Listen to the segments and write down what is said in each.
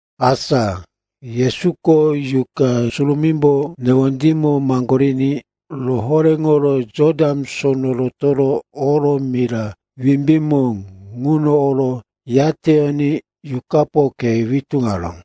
Asa Yesuko Yuqa Surumímbo newondímo maŋgoriní rohoréŋoro Jotan Sono rotoro oro mira wimbímo ŋuno oro yateyoní Yuqapo khe witúŋaró.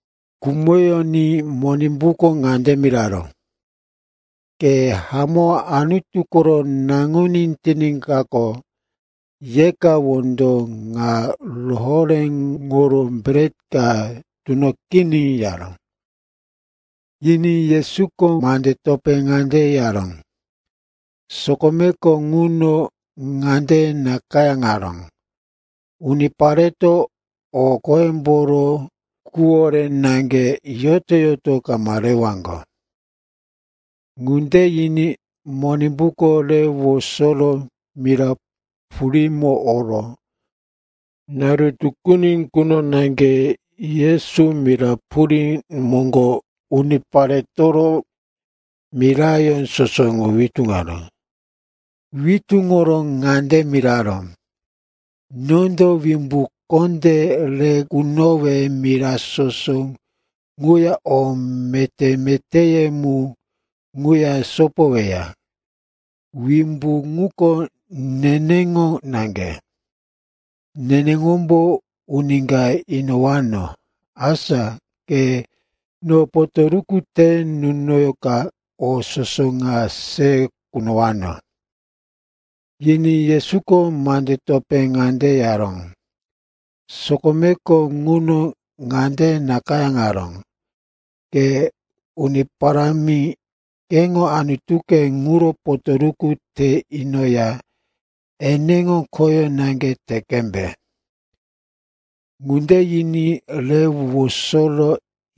Khumoyoní Monimbuko ŋande miraró, “Ke hamó Anutu koro Naŋuní tiníkaqo, yeka wondo ŋa rohoréŋoro bret ka tunoqiní,” yaró. Yiní Yesuko mande topé ŋande yaró, “Sokomeko ŋuno ŋande nakayáŋaró, ‘Unipareto o qoyemboro quwore naŋge yoto-yoto kama rewaŋgo.’” Ŋunde yiní Monimbuko re wosoro mira purímo oro naru tukuni quno naŋge Yesu mira purí moŋgo uniparetoro miraye soso ŋu witúŋaró. Witúŋoro ŋande miraró, “Nondo wimbu kondé re kunowe mira soso ŋuya o meté-metéye mu ŋuya sopoweya. Wimbu ŋuko neneŋo naŋge. Neneŋombo uni ka inowano. Asa ke no potoruku te nunoka o soso ŋa se kunowano.” Yiní Yesuko mande topé ŋande yaró, “Sokomeko ŋuno ŋande nakayáŋaró, ‘Ke Uni Parámi, keŋo Anutuke ŋuro potoruku te inoya eneŋo khoyó naŋge te qembe.’” Ŋunde yiní re wosoro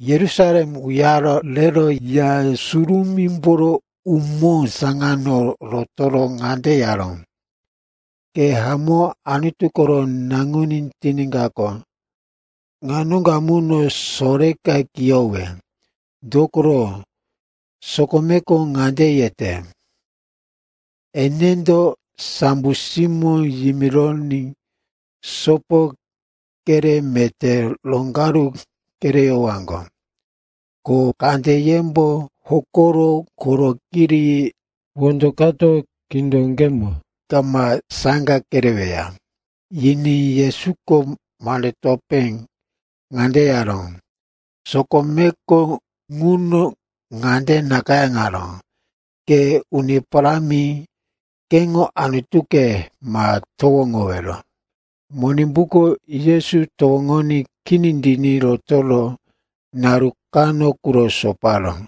Yerusalem uyaro rero Ya Surumímboro umó saŋano rotoro ŋande yaró, “Ke hamó Anutu koro Naŋuní tiníkaqo, ŋa noŋgo amuno soreka kiyowe. Dokoro, sokomeko ŋande yete, “‘Enendo sambo simóŋo yimironí sopo kere meté roŋgaru kereyowaŋgo, ko kandeyembo hokoro koro kiri wondo kato khíndoŋgemo kama saŋga kereweya.’” Yiní Yesuko mande topé ŋande yaró, “Sokomeko ŋuno ŋande nakayáŋaró, ‘Ke Uni Parámi, keŋo Anutuke, ma towoŋowero.’” Monimbuko Yesu towoŋoní kini tiní rotoro naru kano quro soparó.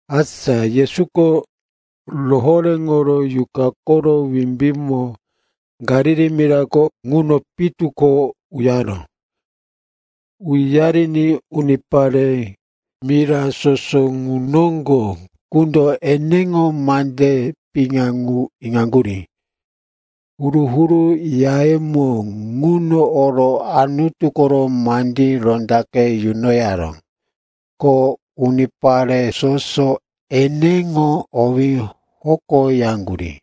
Asa Yesuko rohoréŋoro Yuqa koro wimbímo Galili mirako ŋuno pitu ko uyaró. Uyariní unipare mira soso ŋu noŋgo qundo eneŋo mande piŋa ŋu iŋaŋgurí. Huru-huru yayemo ŋuno oro Anutu koro mandí rondaqe yunoyaró. Ko unipare soso eneŋo owí hokoyaŋgurí.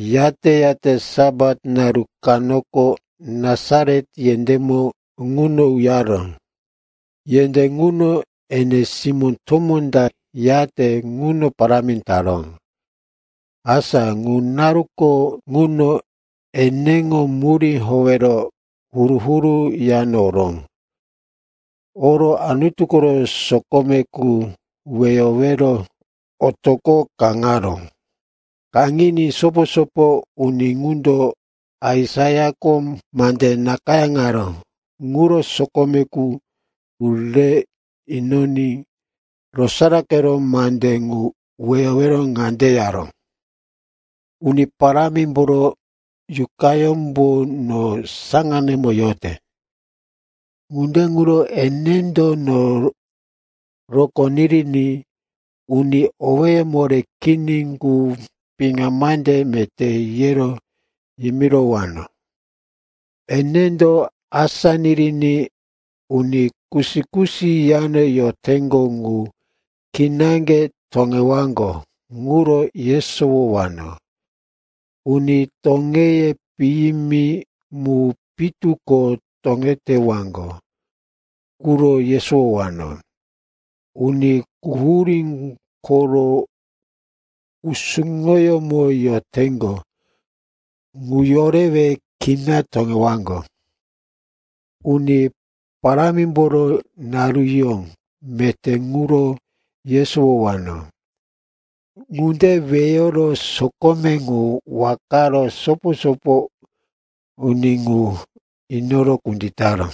Yate-yate Sapat naru kanoko Nasaret yendémo ŋuno uyaró. Yendé ŋuno ene simó tomó ta yate ŋuno parámi taró. Asa ŋu naruko ŋuno eneŋo murí howero huru-huru yano oró. Oro Anutu koro sokome qu weyowero otoqo kaŋaró. Kaŋiní sopo-sopo uni ŋundo Aisaiako mande nakayáŋaró ŋuro sokome qu ŋu re inoní rosaraqero mande ŋu weyoro ŋande yaró, “‘Uni Parámimboro Yuqayómbo no saŋanemo yote. Ŋunde ŋuro enendo no rokó niriní uni owéye moré kini ŋu piŋa mande meté yero yimirowano. Enendo asá niriní uni kusi-kusi yano yoteŋgo ŋu kinaŋge toŋewaŋgo ŋuro yesowowano, uni toŋeye piyimi mu pitu ko toŋetewaŋgo ŋuro yesowowano, uni quhurí koro kusuŋoyómo yoteŋgo ŋu yorewe kina toŋewaŋgo, Uni Parámimboro naruyó meté ŋuro yesowowano.’” Ŋunde weyoro sokome ŋu wakaro sopo-sopo uni ŋu inoro kunditaró.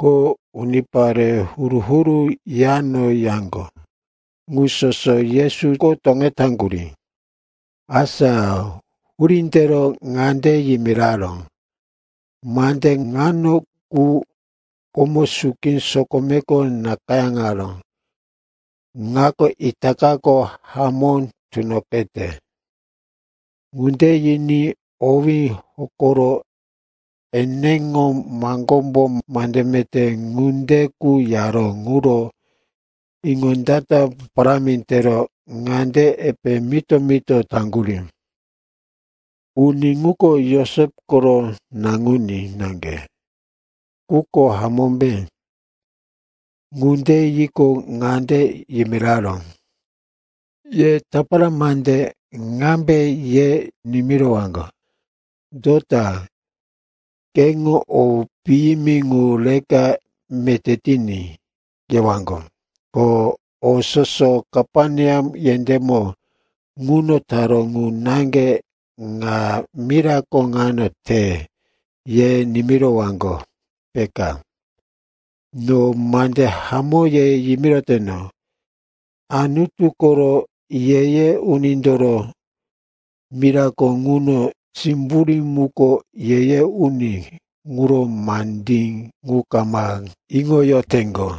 Ko unipare huru-huru yano yaŋgo ŋu soso Yesuko toŋetaŋgurí. Asa hurí tero ŋande yimiraró, “Mande ŋano qu komo suki sokomeko nakayáŋaró ŋako itakako hamó tunoqete.” Ŋunde yiní owí hokoro eneŋo maŋgómbo mande meté ŋunde qu yaró ŋuro iŋondata parámi tero ŋande epe mito-mito taŋgurí, “Uni ŋuko Josep koro naŋuní naŋge, ŋuko hamómbe?” Ŋunde yiqo, ŋande yimiraró, “Ye tapara mande ŋambe ye nimirowaŋgo, ‘Dota, keŋo o piyimi ŋu reka meté tiní,’ yewaŋgo, ko, ‘O soso Kaperneam yendémo ŋuno taró ŋu naŋge ŋa mirako ŋano te,’ ye nimirowaŋgo, peka. No mande hamó ye yimiroteno, Anutu koro ye-ye unindoro mirako ŋuno simburí muko ye-ye uni ŋuro mandí ŋu kama iŋoyoteŋgo.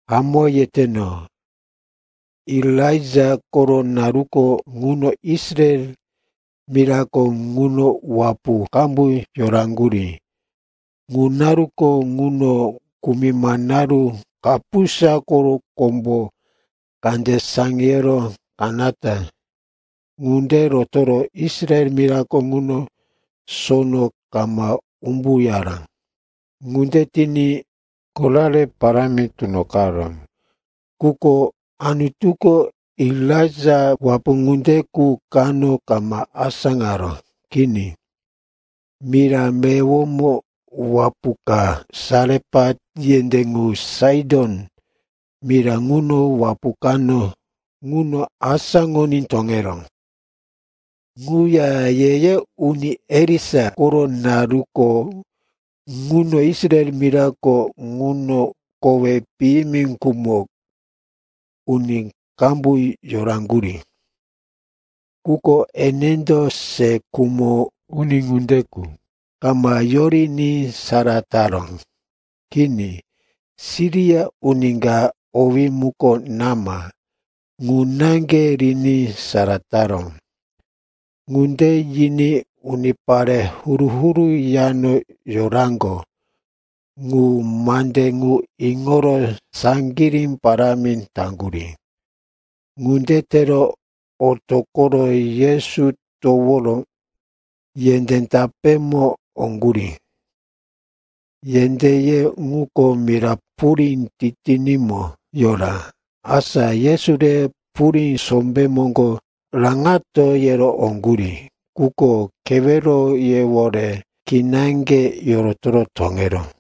Hamó yeteno, Elaija koro naruko ŋuno Israel mirako ŋuno wapu qambu yoraŋgurí. Ŋu naruko ŋuno kumima naru kapusa ko kombo kande saŋiyoro kanata ŋunde rotoro Israel mirako ŋuno sono kama umbuyaró. Ŋunde tiní korare parámi tunoqaró. Quko Anutuko Elaija wapu ŋunde qu kano kama asáŋaró. Kini, mira meyowomo wapu ka, Sarepat yendé ŋu Saiton mira ŋuno wapu kano, ŋuno asáŋoní toŋeró. Ŋuya ye-ye uni Elisa koro naruko ŋuno Israel mirako ŋuno koweye piyimi khumo uni qambu yoraŋgurí. Quko enendo se khumo uni ŋunde qu kama yoriní sara taró. Kini, Siria uni ka owí muko Naman, ŋu naŋge riní sara taró.” Ŋunde yiní unipare huru-huru yano yoraŋgo ŋu mande ŋu iŋoro saŋgirí parámi taŋgurí. Ŋunde tero otoqoro Yesu toworo yendé tapémo oŋgurí. Yendéye ŋuko mira purí titinímo yaró. Asa Yesu rero, purí sombé moŋgo raŋato, yero oŋgurí. Quko keweroyewore kinaŋge yorotoro toŋeró.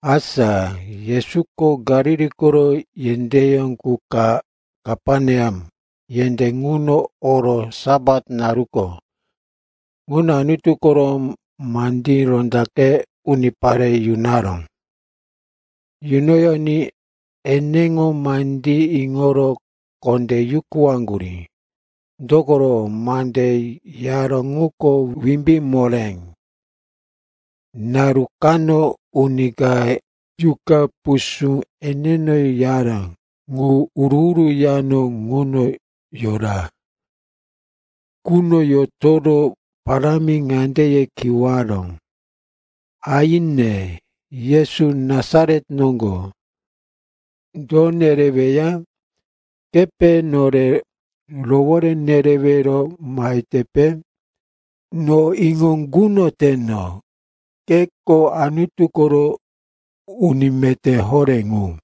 Asa Yesuko Galili koro yendéyó qu ka, Kaperneam yendé ŋuno oro Sapat naruko ŋuno Anutu koro mandí rondaqe unipare yunaró. Yunoyoní eneŋo mandí iŋoro kondé yukuwaŋgurí. Dokoro mande yaró ŋuko wimbí moré. Naru kano uni ka yuqa pusú eneno yaró ŋu huru-huru yano ŋuno yora. Ŋuno yotoro parámi ŋande ye kiwaró, “Aine, Yesu Nasaret noŋgo, do nereweya? Kepe nore rowore nerewero mahetepe? No iŋo kunoteno, keko Anutu koro uni meté horé ŋu.”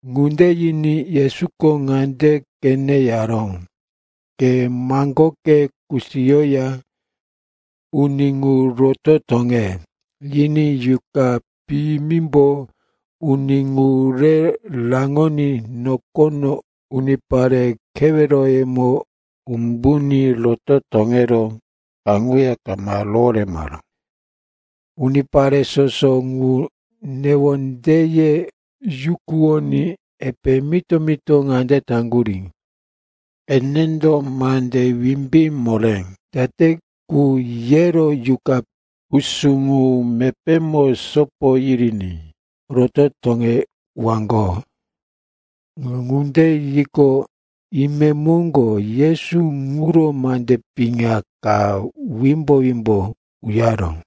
Ŋunde yiní Yesuko ŋande qene yaró, “Ke maŋgoke kusiyoya uni ŋu roto toŋe!” Yiní yuqa piyimimbo uni ŋu re raŋoní nokono unipare keweroyemo umbuní roto toŋero kaŋuya kama roworemaró. Unipare soso ŋu newondeye yukuwoní epe mito-mito ŋande taŋgurí, “Enendo mande wimbí moré date qu yero yuqa pusú ŋu mepémo sopo yiriní roto toŋewaŋgo?” Ŋunde yiqo, imemoŋgo Yesu ŋuro mande piŋa ka wimbo-wimbo uyaró.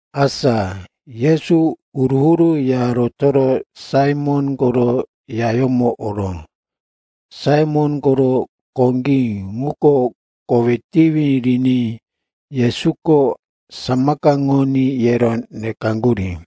Asa Yesu huru-huru ya rotoro Saimon koro yayómo oró. Saimon koro koŋgí ŋuko kowí tiwi riní Yesuko samakaŋoní yero nekaŋgurí.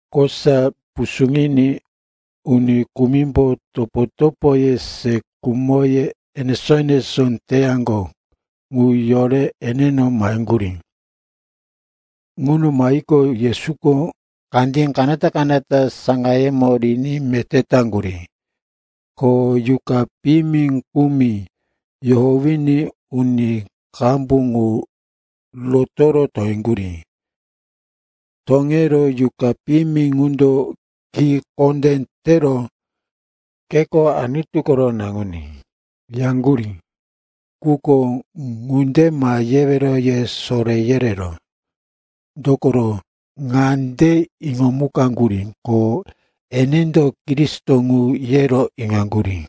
Kosa pusuŋiní uni kumimbo topo-topoye se khumo enesó-enesó teyaŋgo ŋu yore eneno maheŋgurí. Ŋuno mahiqo, Yesuko kandí kanata-kanata saŋayemo riní meté taŋgurí. Ko yuqa piyimi kumi yohowiní uni qambu ŋu roto toŋeŋgurí. Toŋero yuqa piyimi ŋundo ki kondé tero, “Keko Anutu koro Naŋuní,” yaŋgurí. Quko, ŋunde ma yewero, ye soré yereró, dokoro ŋande iŋomukaŋgurí, ko eneko Kristo ŋu, yero iŋaŋgurí.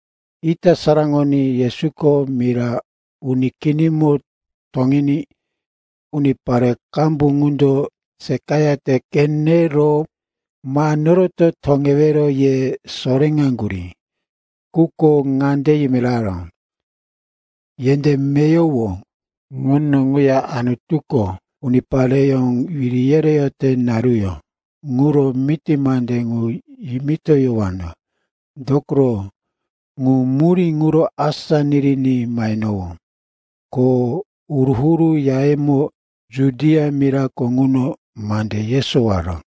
Ita saraŋoní Yesuko mira uni kinimo toŋiní unipare qambu ŋundo seqayate qenero, ma noroto toŋewero, ye soréŋaŋgurí. Quko ŋande yimiraró, “Yendé meyowo ŋuno ŋuya Anutuko unipareyó wiri yereyote naruyó ŋuro miti mande ŋu yimitoyowano. Dokoro ŋu murí ŋuro asá niriní mahenowó.” Ko huru-huru yayemo Judia mirako ŋuno mande yesowoyara.